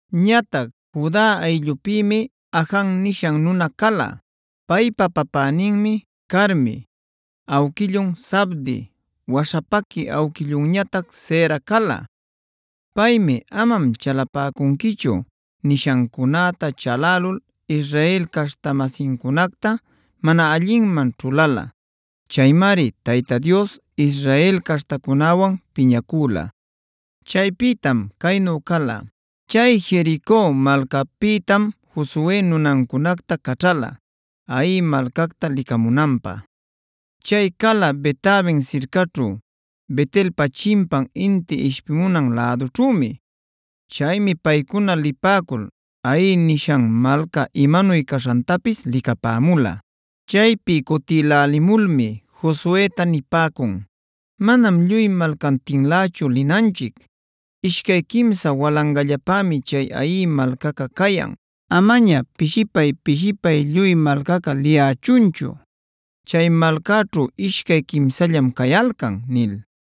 Ñatac Juda ayllupïmi Ajan nisha nuna cala. Paypa papäninmi Carmi, awquillun Zabdi, waśhapaqui awquillunñatac Zera cala. Paymi amam chalapäcunquichu nishancunäta chalälul Israel caśhta-masincunacta mana allinman ćhuläla. Chaymari Tayta Dios Israel caśhtacunäwan piñacüla. Chaypïtam caynu cala: chay Jerico malcapïtam Josue nunancunacta caćhäla Hai malcacta licamunanpä. Chay cala Bet-aven sircaćhu, Bet-elpa chimpan inti ishpimunan lädućhümi. Chaymi paycuna lipäcul Hai nishan malca imanuy caśhantapis licapämula. Chaypi cutïlälimulmi Josueta nipäcun: “Manam lluy malcantinlächu linanchic, ishcay quimsa walangallapämi chay Hai malcaca cayan. Amaña pishipay-pishipay lluy malcaca liyächunchu; chay malcaćhu ishcay quimsallam cayalcan” nil.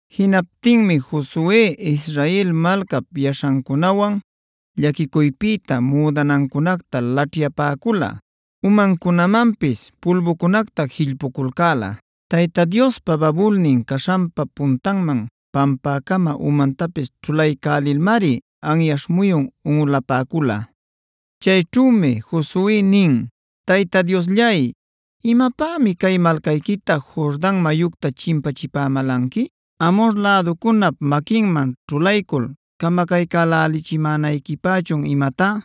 Jinaptinmi Josue Israel malcap yaśhancunawan llaquicuypïta müdanancunacta llaćhyapäcula, umancunamanpis pulbucunacta jillpuculcäla. Tayta Diospa babulnin caśhanpa puntanman pampäcama umantapis ćhulaycälilmari anyaśh muyun unꞌulapäcula. Chayćhümi Josue nin: Tayta Diosllay, ¿imapämi cay malcayquita Jordan mayucta chimpachipamälanqui? ¿Amhor läducunap maquinman ćhulaycul camacaycälälichimänayquipächun imatá?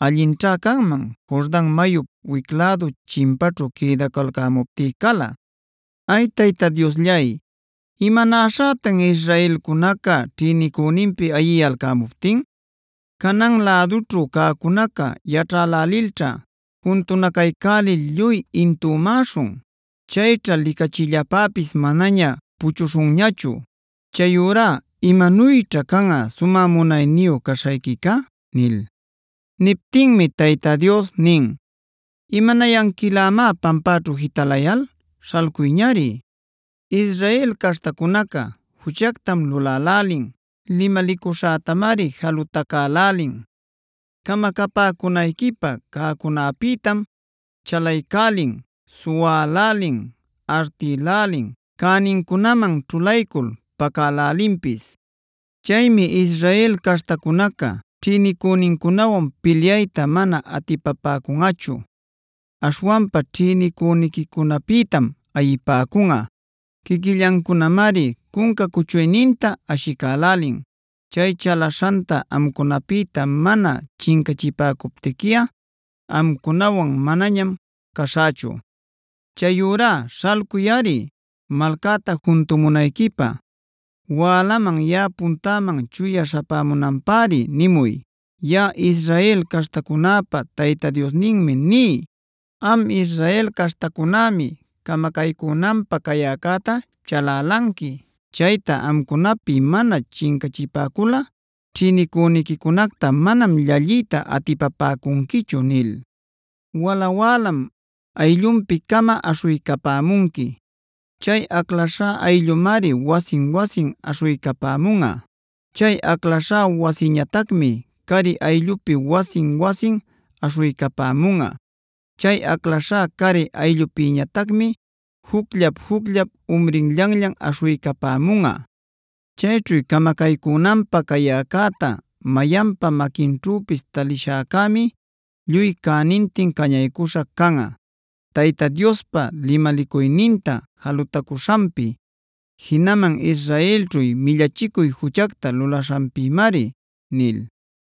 Allinćha canman Jordan mayup wic lädu chimpaćhu quïdacalcämuptí cala. ¡Ay, Tayta Diosllay! ¿Imanaśhätan israelcunaca ćhïnicüninpi ayiyalcämuptin? Canaan lädućhu cäcunaca yaćhälälilćha juntunacaycälil lluy intümäśhun. Chayćha licachillapäpis manaña puchuśhunñachu. Chayurá ¿imanuyćha canꞌa sumä munayniyu cashayquica?” nil. Niptinmi Tayta Dios nin: “¿Imanayanquilämá pampäćhu jitalayal? ¡Śhalcuyñari! Israel caśhtacunaca juchactam lulälälin, limalicuśhätamari jalutacälälin. Camacapäcunayquipäb cäcunäpïtam chalacaycälin, suwälälin, artïlälin, cänincunaman ćhulaycul pacälälinpis. Chaymi Israel caśhtacunaca ćhïnicünincunawan pilyayta mana atipapäcunꞌachu. Aśhwanpa ćhïnicüniquicunapïtam ayipäcunꞌa. Quiquillancunamari cunca cuchuyninta ashicälälin. Chay chalaśhanta amcunapïta mana chincachipäcuptiquiꞌa amcunawan manañam caśhächu. Chayurá śhalcuyꞌari malcäta juntumunayquipä. Wälaman yaꞌap puntäman chuya śhapämunanpäri nimuy. Yaꞌa Israel caśhtacunäpa Tayta Diosninmi ní: ‘Am Israel caśhtacunämi camacaycunanpä cayäcäta chalälanqui. Chayta amcunapi mana chincachipäculꞌa ćhïnicüniquicunacta manam llalliyta atipapäcunquichu’ nil. “Wala wälam ayllunpi-cama aśhuycapämunqui. Chay aclaśhá ayllumari wasin-wasin aśhuycapämunꞌa. Chay aclaśhá wasiñatacmi cari ayllupi wasin-wasin aśhuycapämunꞌa. Chay aclaśhá cari ayllupïñatacmi jucllap-jucllap umrinllanllan aśhuycapämunꞌa. Chayćhu camacaycunanpä cayäcäta mayanpa maquinćhüpis talishäcämi lluy cänintin cañaycuśha canꞌa; Tayta Diospa limalicuyninta jalutacuśhanpi, jinaman Israelćhu millachicuy juchacta lulaśhanpïmari” nil.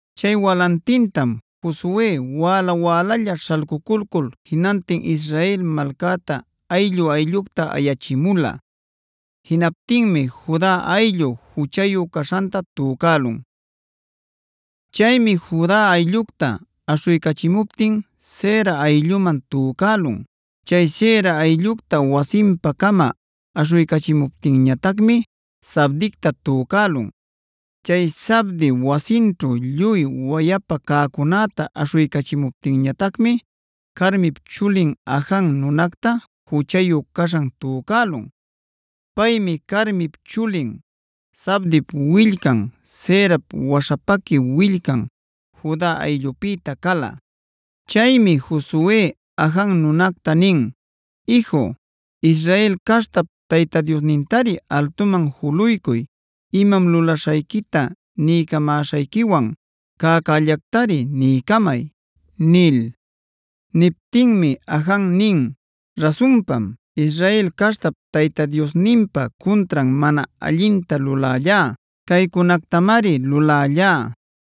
Chay walantintam Josue wäla-wälalla śhalcuculcul jinantin Israel malcäta ayllu-ayllucta ayachimula. Jinaptinmi Juda ayllu juchayu caśhanta tücälun. Chaymi Juda ayllucta aśhuycachimuptin Zera aylluman tücälun. Chay Zera ayllucta wasinpa-cama aśhuycachimuptinñatacmi Zabdicta tücälun. Chay Zabdi wasinćhu lluy wayapa cäcunäta aśhuycachimuptinñatacmi Carmip chulin Ajan nunacta juchayu caśhan tücälun. Paymi Carmip chulin, Zabdip willcan, Zerap waśhapaqui willcan, Juda ayllupïta cala. Chaymi Josue Ajan nunacta nin: “Iju, Israel caśhtap Tayta Diosnintari altuman juluycuy imam lulaśhayquita niycamäśhayquiwan. ¡Cäcällactari niycamay!” nil. Niptinmi Ajan nin: “Rasunpam, Israel caśhtap Tayta Diosninpa cuntran mana allinta lulällá. Caycunactamari lulällá: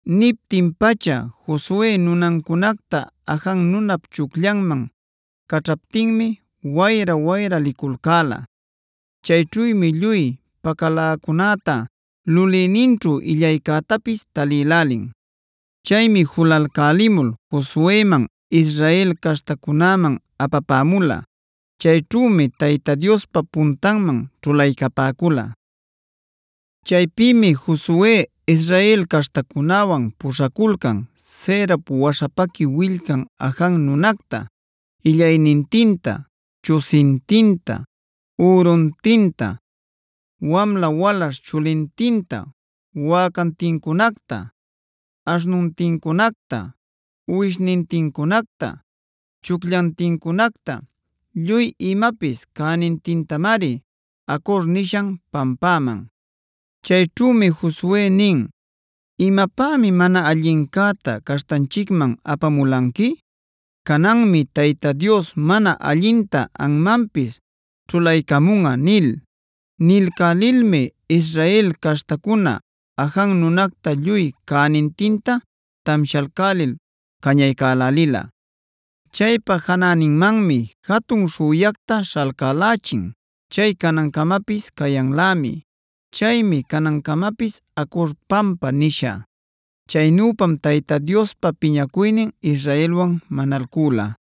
Niptin-pacha Josue nunancunacta Ajan nunap chucllanman caćhaptinmi wayra-wayra liculcäla. Chayćhümi lluy pacaläcunäta, lulïninćhu illaycätapis talïlälin. Chaymi julalcälimul Josueman, Israel caśhtacunäman apapämula. Chayćhümi Tayta Diospa puntanman ćhulaycapäcula. Chaypïmi Josue Israel caśhtacunäwan puśhaculcan Zerap waśhapaqui willcan Ajan nunacta, illaynintinta, chusintinta, üruntinta, wamla-walaśh chulintinta, wäcantincunacta, aśhnuntincunacta, uwishnintincunacta, chucllantincunacta, lluy imapis cänintintamari Acor nishan pampäman. Chayćhümi Josue nin: “¿Imapämi mana allincäta caśhtanchicman apamulanqui? Cananmi Tayta Dios mana allinta anmanpis ćhulaycamunꞌa” nil. Nilcälilmi Israel caśhtacuna Ajan nunacta lluy cänintinta tamshalcälil cañaycälälila. Chaypa janäninmanmi jatun śhüyactac śhalcälächin; chay canancamapis cayanlämi. Chaymi canancamapis Acor pampad nisha. Chaynüpam Tayta Diospa piñacuynin Israelwan manalcüla.